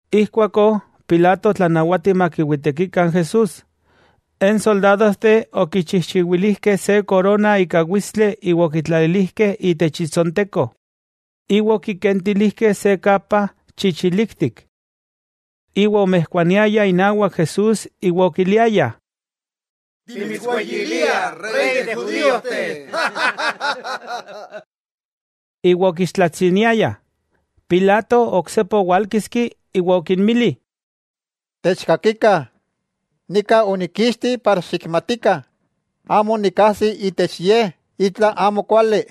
Ijkuakó Pilato otlanawati makiwitekikah n Jesús. N soldadojteh okichijchiwilijkeh se korona ika witstli iwa okitlalilijkeh itech itsonteko, iwa okikentilijkeh se kapa chichiliktik. Iwa omijkuaniayah inawak Jesús iwa okiliayah: —¡Timitsweyiliah, Rey de judíojteh! Iwa okixtlatsiniayah. Pilato oksepa owálkiski iwa okinmili: —Techkakikah, nika onikkixti para xikmatikah amo nikkajsi itech Ye itla amo kuali.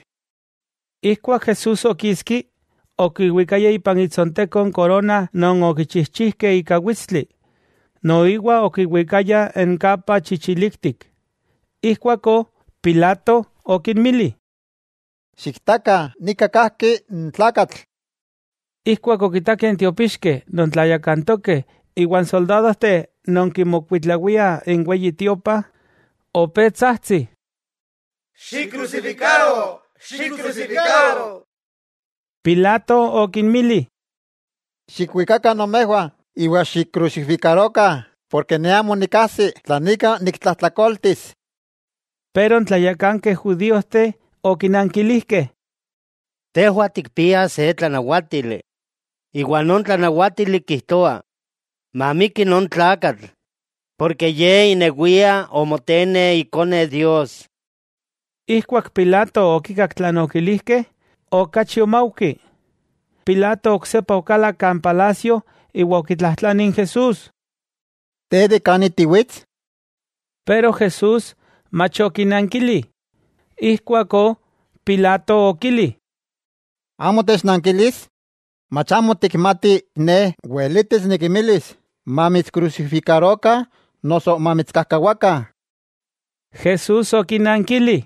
Ijkuak Jesús okiski, okiwikaya ipan itsonteko n korona non okichijchijkeh ika witstli, noiwa okiwikaya n kapa chichiliktik. Ijkuakó Pilato okinmili: —¡Xiktakah, nika kajki n tlakatl! Ijkuak okitakeh n tiopixkeh non tlayakantokeh iwa n soldadojteh non kimokuitlawiah n Weyi Tiopa, opé tsajtsih: —¡Xikkrusifikaro, xikkrusifikaro! Pilato okinmili: —Xikwikakah nomejwah, iwa xikkrusifikarokah, porke ne amo nikajsi tlan ika niktlajtlakoltis. Pero n tlayakankeh judíojteh okinankilijkeh: —Tejwah tikpiah se tlanawátili, iwa non tlanawátili kijtoa mamiki non tlakatl, porke Ye inewia omotene Ikone Dios. Ijkuak Pilato okikak tlan okilijkeh, okachi omaujki. Pilato oksepa okalak kan palasio iwa okitlajtlani n Jesús: —¿Te, de kani tiwits? Pero Jesús mach okinankili. Ijkuakó Pilato okili: —¿Amo technankilis? ¿Mach amo tikmati ne weletis nikimilis mamitskrusifikarokah noso mamitskajkawakah? Jesús okinankili: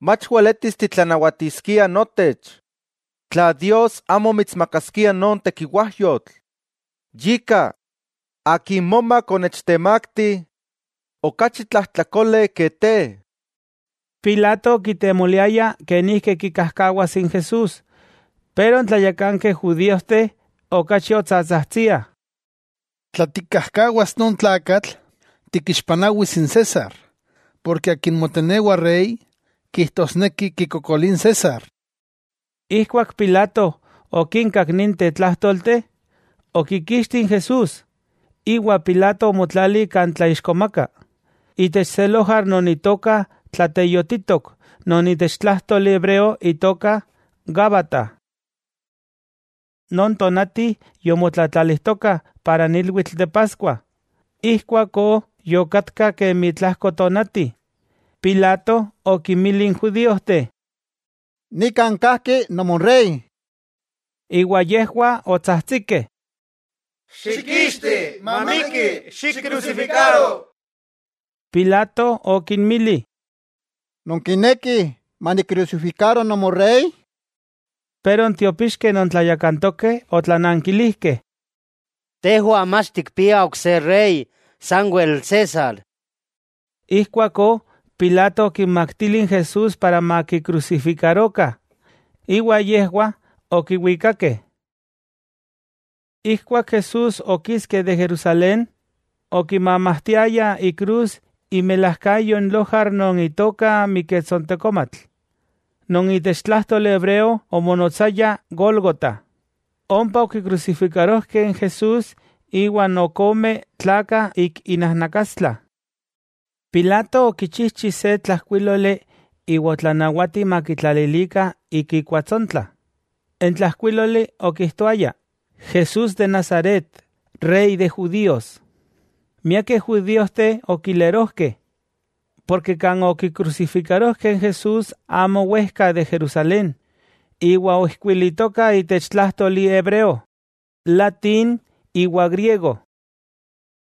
—Mach weletis titlanawatiskia notech tla Dios amo mitsmakaskia non tekiwajyotl. Yika, akin momak onechtemakti, okachi tlajtlakole ke te. Pilato okitemoliaya kenijki kikajkawas n Jesús, pero n tlayakankeh judíojteh okachi otsatsajtsiah: —¡Tla tikkajkawas non tlakatl, tikixpanawis n César, porke akin motenewa rey, kijtosneki kikokolia n César! Ijkuak Pilato okinkak ninteh tlájtolteh, okikixti n Jesús, iwa Pilato omotlali kan tlaixkomaka, itech se lojar non itoka Tlateyotitok non itech tlájtoli hebreo itoka Gábata. Non tonati yomotlatlalijtokah para n ilwitl de Paskua, ijkuakó yokatka kemi tlajko tonati, Pilato okinmili n judíojteh: —¡Nikan kajki nomorey! Iwa yejwah otsajtsikeh: —¡Xikixti! ¡Mamiki! ¡Xikkrusifikaro! Pilato okinmili: —¿Nonkinekih manikkrusifikaro nomorey? Pero n tiopixkeh non tlayakantokeh otlanankilijkeh: —¡Tejwah mach tikpiah ok se rey, sanwel César! Ijkuakó Pilato okinmaktili n Jesús para makikrusifikarokah, iwa yejwah okiwikakeh. Ijkuak Jesús okiski de Jerusalén, okimamajtiaya ikrus imilajkayo n lojar non itoka Miketsontekomatl, non itech tlájtoli hebreo omonotsaya Gólgota. Ompa okikrusifikarojkeh n Jesús iwa n ok ome tlakah ik inajnakastla. Pilato okichijchi se tlajkuíloli iwa otlanawati makitlalilikah ik ikuatsontla. N tlajkuíloli okijtoaya: “Jesús de Nazaret, Rey de judíos.” Miakeh judíojteh okiamapoah, porke kan okikrusifikarojkeh n Jesús amo wejka de Jerusalén, iwa oijkuilitoka itech tlájtoli hebreo, latín iwa griego.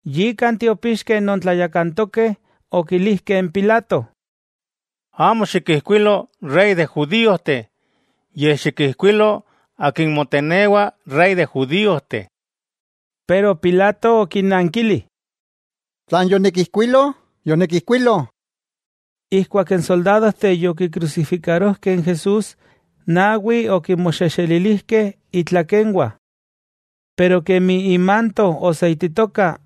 Yika n tiopixkeh non tlayakantokeh okilijkeh n Pilato: —Amo xikijkuilo “Rey de judíojteh”; yej xikijkuilo “Akin motenewa Rey de judíojteh.” Pero Pilato okinnankili: —Tlan yonikijkuilo, yonikijkuilo. Ijkuak n soldadojteh yokikrusifikarojkeh n Jesús, nawi okinmoxexelilijkeh itlakenwah. Pero kemi imanto oseititoka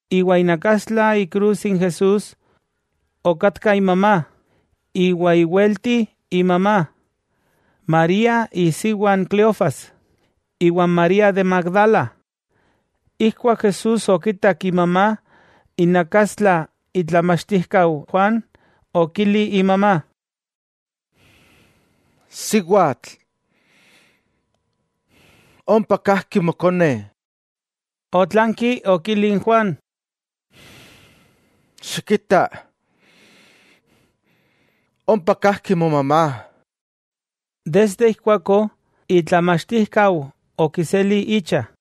Iwa inakastla ikrus n Jesús, okatka imamá, iwa iwelti imamá, María isiwa n Cleofas, iwa n María de Magdala. Ijkuak Jesús okitak imamá inakastla itlamachtijkau Juan, okili imamá: —Siwatl, ompa kajki mokone. Otlanki okili n Juan: —Xikita, ompa kajki momamá. Desde ijkuakó itlamachtijkau okiseli icha.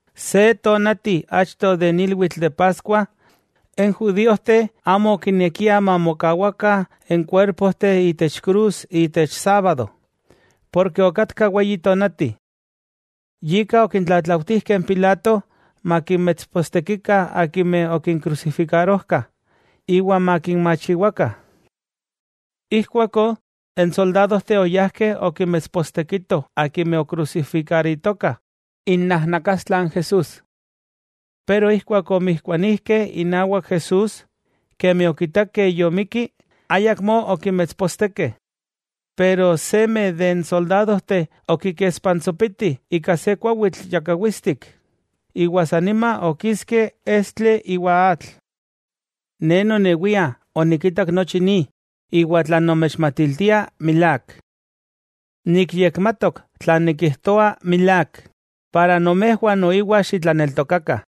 Se tonati achto de n ilwitl de Paskua, n judíojteh amo okinekiah mamokawakah n kuerpojteh itech krus itech sábado, porke okatka weyi tonati. Yika okitlatlautijkeh n Pilato makinmetspostekikah akimeh okinkrusifikarojkah, iwa makinmachiwakah. Ijkuakó n soldadojteh oyajkeh okinmetspostekitoh akimeh okrusifikaritokah inajnakastla n Jesús. Pero ijkuak omijkuanijkeh inawak Jesús, kemi okitakeh yomikki, ayakmó okimetspostekeh. Pero seme de n soldadojteh okikespantsopiti ika se kuawitl yakawitstik, iwa sanima okiski estli iwa atl. Ne nonewia onikitak nochi ni, iwa tlan nomechmatiltia milák. Nikmatok tlan nikijtoa milák, para nomejwah noiwa xitlaneltokakah.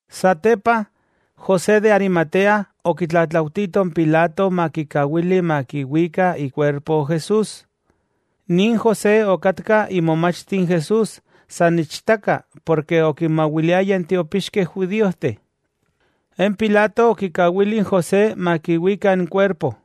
Satepa, José de Arimatea okitlatlaujtito n Pilato makikawili makiwika ikuerpo Jesús. Nin José okatka imomachti n Jesús san ichtaka porke okinmawiliaya n tiopixkeh judíojteh. N Pilato okikawili n José makiwika n kuerpo.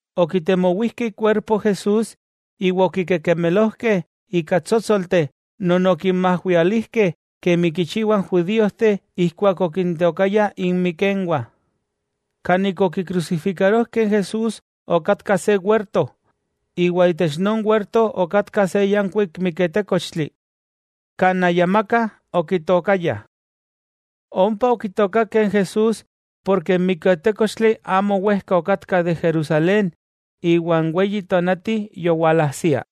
Okitemowijkeh ikuerpo Jesús iwa okikekemelojkeh ika tsótsolteh non okinmajwialijkeh kemi kichiwah n judíojteh ijkuak okintookayah inmikenwah. Kan okikrusifikarojkeh n Jesús okatka se werto, iwa itech non werto okatka se yankuik miketékochtli, kan ayamaka okitookayah. Ompa okitookakeh n Jesús porke n miketékochtli amo wejka okatka de Jerusalén iwa n weyi tonati yowalajsia.